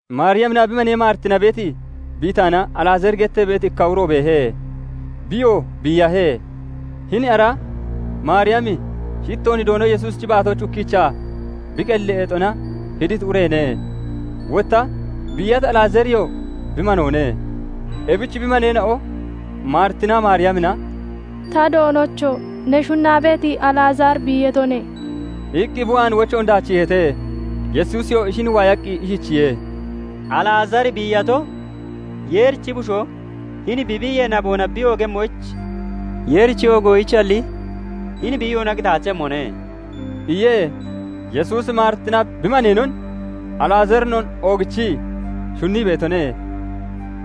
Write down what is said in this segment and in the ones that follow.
Maariyaminaa bi manee Maaritina beeti Bitaana Alazaari gettee beeti ikka uro beehe; biyoo biiyahe. Hini ara Maariyami shittoon Doono Yesuusichi baatooch ukkiichaa bi qelli eexona hiditi ureene; wotta biiyati Alazaariyoo bi manoone. Ebich bi maneena'o Maritinaa Maariyamina "Ta Doonocho! Ne shunnaa beeti Alazaari biiyatone" iqqi bi waan wochoon daachiiheete. Yesuusiyoo ishin waayaqqi ishichiye:- "Alazaari biiyato, Yeerichi Bushoo hini bi biiyee naboona bi oogemmoyich Yeerichi oogoyichalli hini biiyoona qitaachemmone" iye. Yesuusi Maaritinaa bi maneenon, Alazaarinoo oogichii shunnii beetone.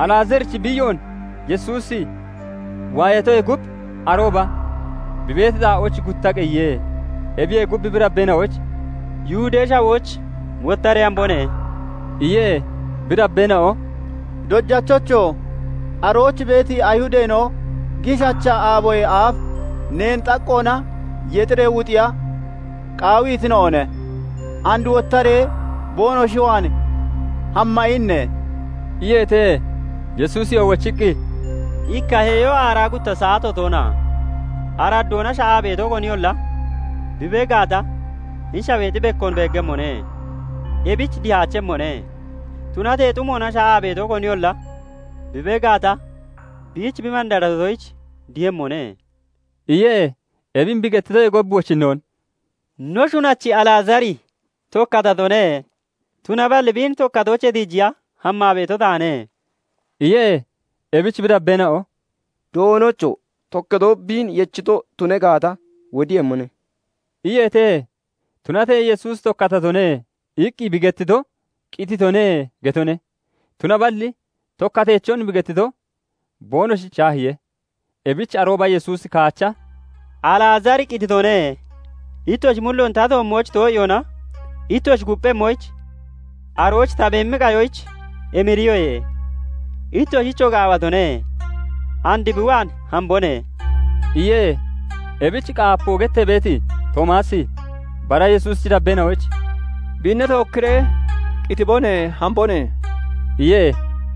Alazaarichi biiyoon Yesuusi waayatoyee gub, arooba bi beeti xaa'ooch gutta qeyiye. Ebiyee gub, bi dabbeena'oyich "Yihudee Shawooch wottaree hambone" iye. Bi dabbeena'o "Dojachocho! Arooch beeti Ayihudeena'o giishacha aaboyee aaf neen xaqqoona yexiree wuxiya qaawitina'one; and wottaree boonoshi waan hamma inne?" iyeete. Yesuusiyoo wochiqqi, "Ikka heeyo aaraa gutta saato toona? Araddoona sha'aa beeto koniyolla bi bee gaata, hini shaweexi bekkoon beeggemmone; ebich dihaachemmone. Tunatee xumoona sha'aa beeto koniyolla bi bee gaata, biich bi mandaratoyich dihemmone" iye. Ebin bi gettitoyee gub wochinnoon "No shunachi Alazaari tokkatatone; tunaballi biin tokkatoochee tiijiya hammaa beeto taane" iye. Ebich bi dabbeena'o "Doonocho! Tokkatoo biin yechito tuna gaata, wodemmone" iyeete. Tunatee Yesuusi "Tokkatatone" iqqi bi gettito, "Qititone" getone; tunaballi tokkateechon bi gettito boonoshich shaahiye. Ebich arooba Yesuusi kaacha "Alazaari qititone; Ittoshi mulloon ta toommooch too'iyoona ittoshi kupphemmoyich, arooch ta beemi qayoyich emirihoye; ittoshichoo gaawatone. And bi waan hambone" iye. Ebich "Qaapoo" gettee beeti Toomaasi bara Yesuusichi dabbeena'oyich "Biinna tookkiree qitibone; hambone" iye.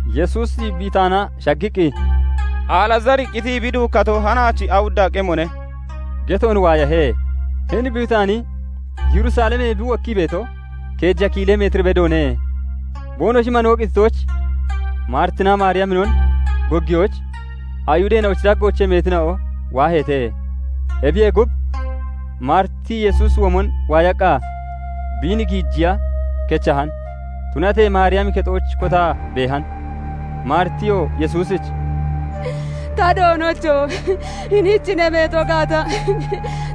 Yesuusi Bitaana shaggiqqi, "Alazaari qitii bi duukkato hanaach awudda qemone" geton waayahe. Hini Bitaani Yerusalemee bi wokkii beeto keeja kiilee meetir bedoone. Boonoshi manoo qititoyich Maaritinaa Maariyaminon goggiyoyich, Ayihudeena'ochi daggoochee meetina'o waaheete. Ebiyee gub, Maariti Yesuusi womon waayaqqa biin giijiya kechahan; tunatee Maariyami kexooch kotaa beehan. Maaritiyoo Yesuusich "Ta Doonocho! Hiniich ne beeto gaata,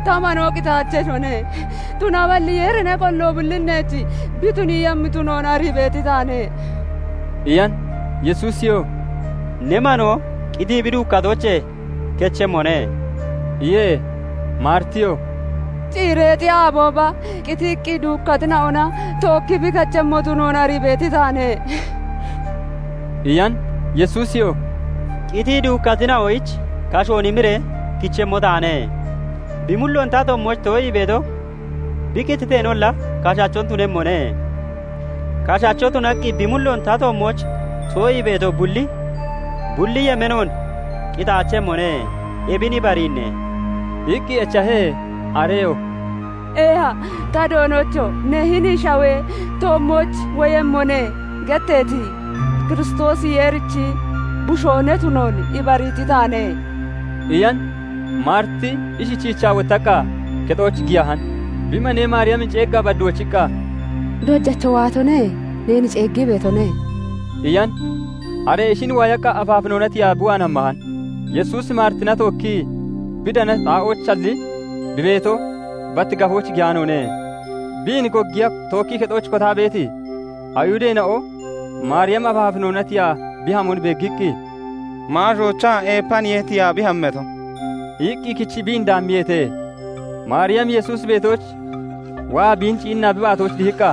ta manoo qitaacheshone. Tunaballi Yeeri ne qollammo bullin neech bi tuniiyemmo tunoon arii beeti taane" iyan. Yesuusiyoo "Ne manoo qitii bi duukkatoochee kechemmone" iye. Maaritiyoo "Ciireexi aabooba qitii duukkatina'ona tookki kechemmo bi tunoon arii beeti taane" iyan. Yesuusiyoo "Qitii duukkatina'oyich kashoon imiree kichemmo taane. Bi mulloon ta toommooch too'ii beeto bi qititeenolla kashachon tunemmone; kashacho tunaqqi bi mulloon ta toommooch too'ii beeto bulli, bulli yemeenoon qitaachemmone. Ebin ibariinne?" iqqi echahe. Areyoo "Eeha, ta Doonocho! Ne 'Hini shawee toommooch woyemmone' getteeti Kiristoosi Yeerichi Bushoo ne tunoon ibariiti taane" iyan. Maariti ishichiichaa wottaqqa kexooch giyahan. Bi manee Maariyamin ceeggaa bad wochiqqa, "Dojacho waatone; neen ceeggii beetone" iyan. Are ishin waayaqqa afaafinoona tiyaa bi waan hammahan. Yesuusi Maaritina tookkii bi danati xaa'oochalli bi beeto bat gafooch giyaanoone. Biin goggiya tookkii kexooch kotaa beeti Ayihudeena'o Maariyami afaafinoona tiyaa bi hamon beeggiqqi, "Maashoochaa eepaniye tiyaa bi hammato" iqqi kechii biin dabbiyeete. Maariyami Yesuusi beetooch waa biin ciinnaa bi baatooch dihiqqa,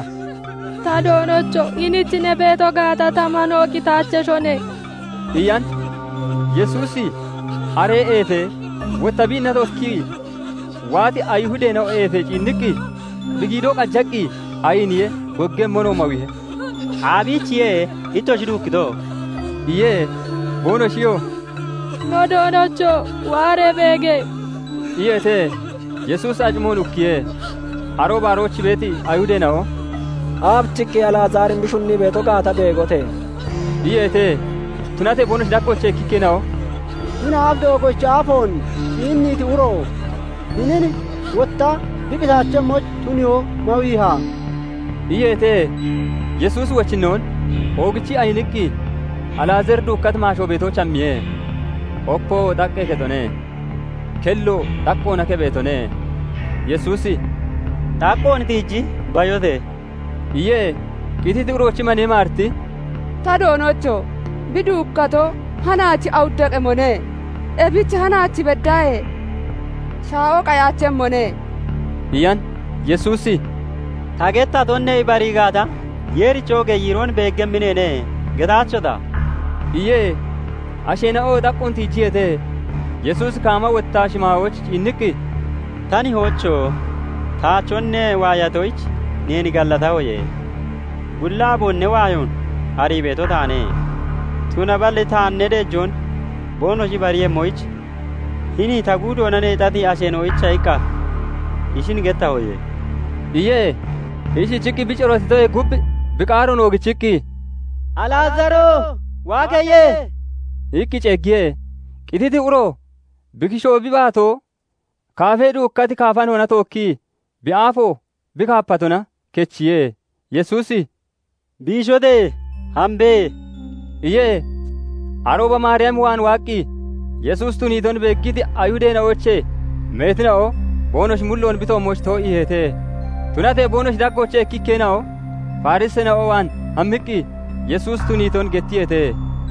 "Ta Doonocho! Hiniich ne beeto gaata, ta manoo qitaacheshone" iyan. Yesuusi are eefee, wotta biinna tookkii waati Ayihudeena'o eefee ciinniqqi bi giidoo qajaqqi ayiniye; goggemmonoo mawiihe. "Aabiichiye ittoshi duukkito?" iye. Boonoshiyoo "No Doonocho! Waaree beege!" iyeete. Yesuusi acimoon ukkiye. Arooba arooch beeti Ayihudeena'o "Aabichiqqi Alazaarin bi shunnii beeto gaata beegote!" iyeete. Tunatee boonoshi daggoochee ikkikkeena'o "Hini aaf doogoochi aafoon ciinniiti uro, hinin wotta bi qitaachemmoyich tuniyoon mawiiha?" iyeete. Yesuusi wochinnoon oogichii ayiniqqi Alazaari duukkati maasho beetooch hammiye. Opoo xaqqee kexone; kelloo xaqqoona keppheetone. Yesuusi "Xaqqoon tiiji bayote!" iye. Qititi uroochi manee Maariti "Ta Doonocho! Bi duukkato hanaach awudda qemone. Ebich hanaach beddaahee shaa'o qayaachemmone" iyan. Yesuusi " 'Ta gettaton ne ibarii gaata, Yeerichi oogee yiiroon beeggemmi neene' getaachota?" iye. Asheena'oo xaqqoon tiijiyeete. Yesuusi kaama wottaa shimaayooch ciinniqqi, "Ta Nihoocho! Taachon ne waayatoyich neen gallatahoye. Bulli aaboon ne waayoon arii beeto taane; tunaballi taan ne deejoon boonoshi ibariiyemmoyich, hini ta guudoona neexati asheena'oyicha iqqa ishin gettahoye" iye. Ishichiqqi bi corootitoyee gub bi qaaroon oogichiqqi, "Alazaaro! Waa keye!" iqqi ceeggiye. Qititi uro bi kishoo, bi baatoo kaafee duukkati kaafanoona tookkii, bi aafoo bi kaapatona kechiye. Yesuusi "Biishote! Hambe" iye. Arooba Maariyam waan waaqqi Yesuusi tuniiton beeggiti Ayihudeena'oochee meetina'o boonoshi mulloon bi toommooch too'iiheete; Tunatee boonoshi daggoochee ikkikkeena'o Fariseena'o waan hammiqqi Yesuusi tuniiton gettiyeete.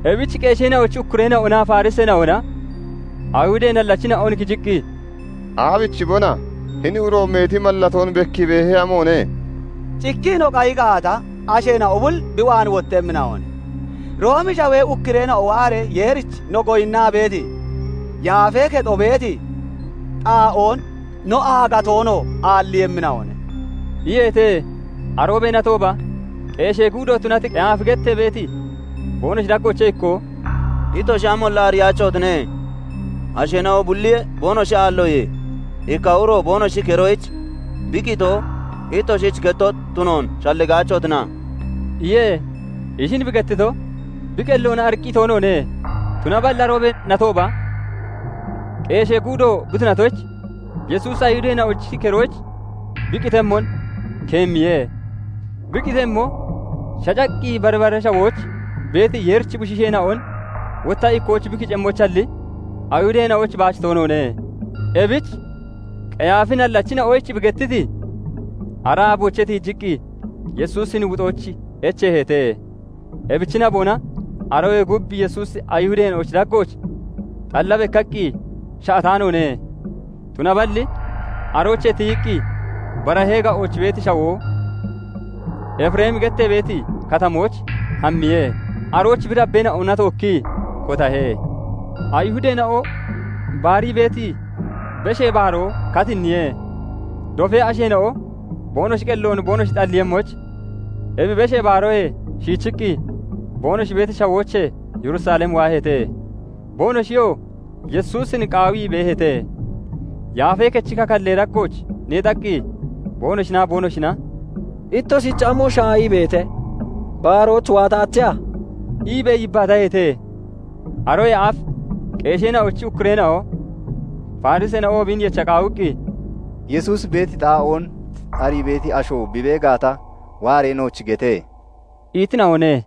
Ebich qeesheena'ochi ukkureena'onaa Fariseena'ona Ayihudee nallachina'on kiciqqi, "Aabichibona? Hini uro meeti mallatoon bekkii beehe amoone! Cikkii no qayi gaata, asheena'o bulli bi waan wottemmina'one; Roomee Shawee ukkureena'o waaree Yeerich no goyinnaa beeti yaafee kexo beeti xaa'oon, no aagatoonoo aalliiyemmina'one" iyeete. Aroobee natooba qeeshee guudo tunati Qeyaafi gettee beeti, boonoshi daggoochee ikkoo "Ittoshi amoonolla ariyaachotine. Asheena'o bulli boonoshi aalloye, ikka uro boonoshi keroyich bi qitoo ittoshich kettoo tunoon shalligaachotina?" iye. Ishin bi gettito, bi qelloona ariiqqi toonoone; tunaballi aroobee natooba qeeshee guudo bi tunatoyich, Yesuusi Ayihudeena'ochi keroyich bi qitemmon keemmiye; Bi qitemmo, shacaqqi bari bara shawooch beeti Yeerichi Bushiisheena'on wotta ikkooch bi kicemmoyichalli, Ayihudeena'oyich baach toonoone. Ebich Qeyaafi nallachina'oyich bi gettiti ara aaboochee tiijiqqi Yesuusin wuxoyich echeeheete. Ebichi naboona aroyee gub Yesuusi Ayihudeena'ochi daggooch xalla bekkaqqi sha'ataanoone; tunaballi aroochee tiyiqqi barahee ga'ooch beeti shawoo, Efiremi gettee beeti katamooch hammiye; arooch bi dabbeena'ona tookkii kotahe. Ayihudeena'o baarii beeti Beshee Baaroo katinniye. Dofee asheena'o boonoshi qelloon boonoshi xalliiyemmoyich, ebi Beshee Baaroyee shiichiqqi boonoshi beeti shawoochee Yerusalem waaheete. Boonoshiyoo Yesuusin qaawii beeheete; Yaafee Kechi kakallee daggooch neexaqqi boonoshinaa boonoshina "Ittoshich amo shaahii beete? Baarooch waataacheha?" iibee yibbaataheete. Aroyee aaf qeesheena'ochi ukkureena'o, Fariseena'oo biin yecha qaawiqqi, "Yesuusi beeti xaa'oon arii beeti asho bi bee gata, waaree nooch gete!" itina'one.